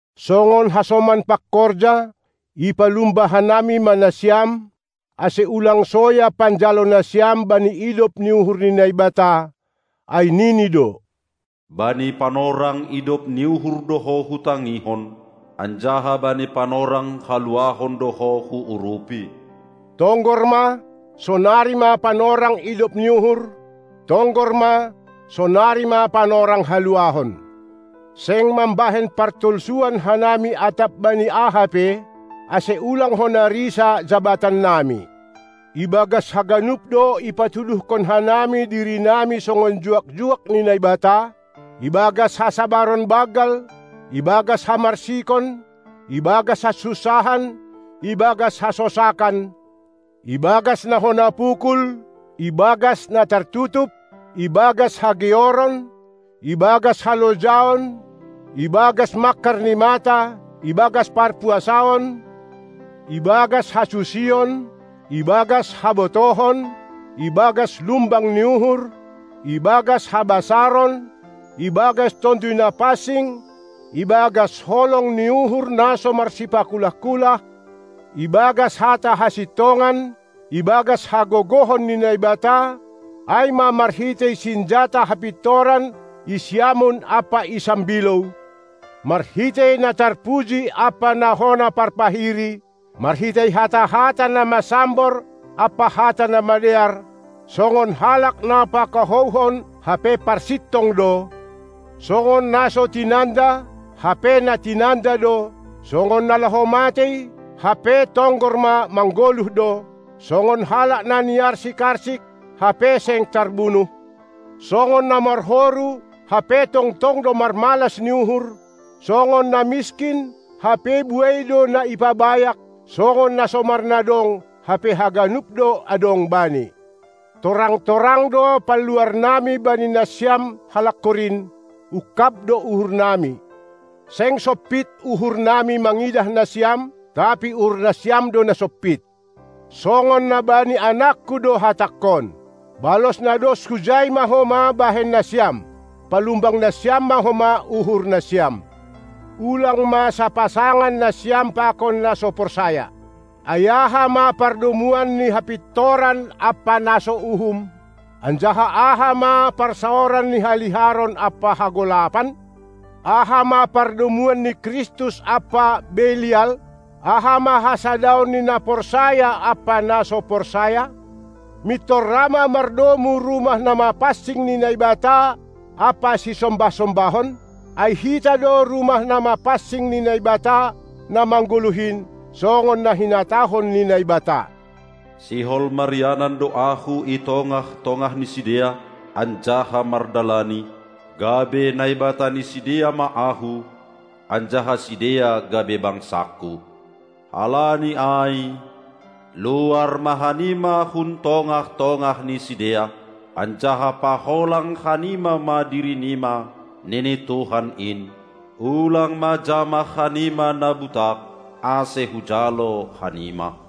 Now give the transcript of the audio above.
Songon hasoman pangkorja, ipalumba hanami ma nasiam, ase ulang soya panjalo nasiam bani idop ni uhur ni Naibata, ai nini do: Bani panorang idop ni uhur do ho hutangihon, anjaha bani panorang haluahon do ho huurupi. Tonggor ma, sonari ma panorang idop ni uhur, tonggor ma, sonari ma panorang haluahon. Seng mambahen partolsuan hanami atap bani aha pe, ase ulang hona risa jabatannami. Ibagas haganup do ipatuduhkon hanami dirinami songon juak-juak ni Naibata: Ibagas hasabaron banggal, ibagas hamarsikon, ibagas hasunsahan, ibagas hasosakan, ibagas na hona pukul, ibagas na tartutup, ibagas hageoron, ibagas halojaon, ibagas mangkar ni mata, ibagas parpuasaon, ibagas hasusion, ibagas habotohon, ibagas lumbang ni uhur, ibagas habasaron, ibagas Tonduy Na pansing, ibagas holong ni uhur na so marsipakulah-kulah, ibagas hata hasintongan, ibagas hagogohon ni Naibata, ai ma marhitei sinjata hapintoran i siamun ampa i sambilou; marhitei na tarpuji ampa na hona parpahiri, marhitei hata-hata na masambor ampa hata na madear; songon halak na pakahouhon, hape parsintong do; songon na so tinanda, hape na tinanda do; songon na laho matei, hape tonggor ma manggoluh do; songon halak na niarsik-arsik, hape seng tarbunuh; songon na marhoru, hape tongtong do marmalas ni uhur; songon na miskin, hape buei do na i pabayak songon na so marnadong, hape haganup do adong bani. Torang-torang do panluarnami bani nasiam, halak Korint, ungkab do uhurnami. Seng sompit uhurnami mangidah nasiam, tapi uhur nasiam do na sompit. Songon na bani anakku do hatangkon: Balos na dos hujai ma homa bahen nasiam: Palumbang nasiam ma homa uhur nasiam! Ulang ma sapasangan nasiam pakon na so porsaya! Ai aha ma pardomuan ni hapintoran ampa na so uhum, anjaha aha ma parsaoran ni haliharon ampa hagolapan? Aha ma pardomuan ni Kristus ampa Belial? Aha ma hasadaon ni na porsaya ampa na so porsaya? Mintor ra ma mardomu rumah na mapansing ni Naibata ampa sisombah-sombahon? Ai hita do rumah na mapansing ni Naibata na manggoluh in, songon na hinatahon ni Naibata: Sihol marianan do Ahu i tongah-tongah ni sidea anjaha mardalani, gabe Naibata ni sidea ma Ahu, anjaha sidea gabe bangsangku. Halani ai, luar ma hanima hun tongah-tongah ni sidea, anjaha paholang hanima ma dirinima, nini Tuhan in; ulang ma jamah hanima na butak, ase hujalo hanima!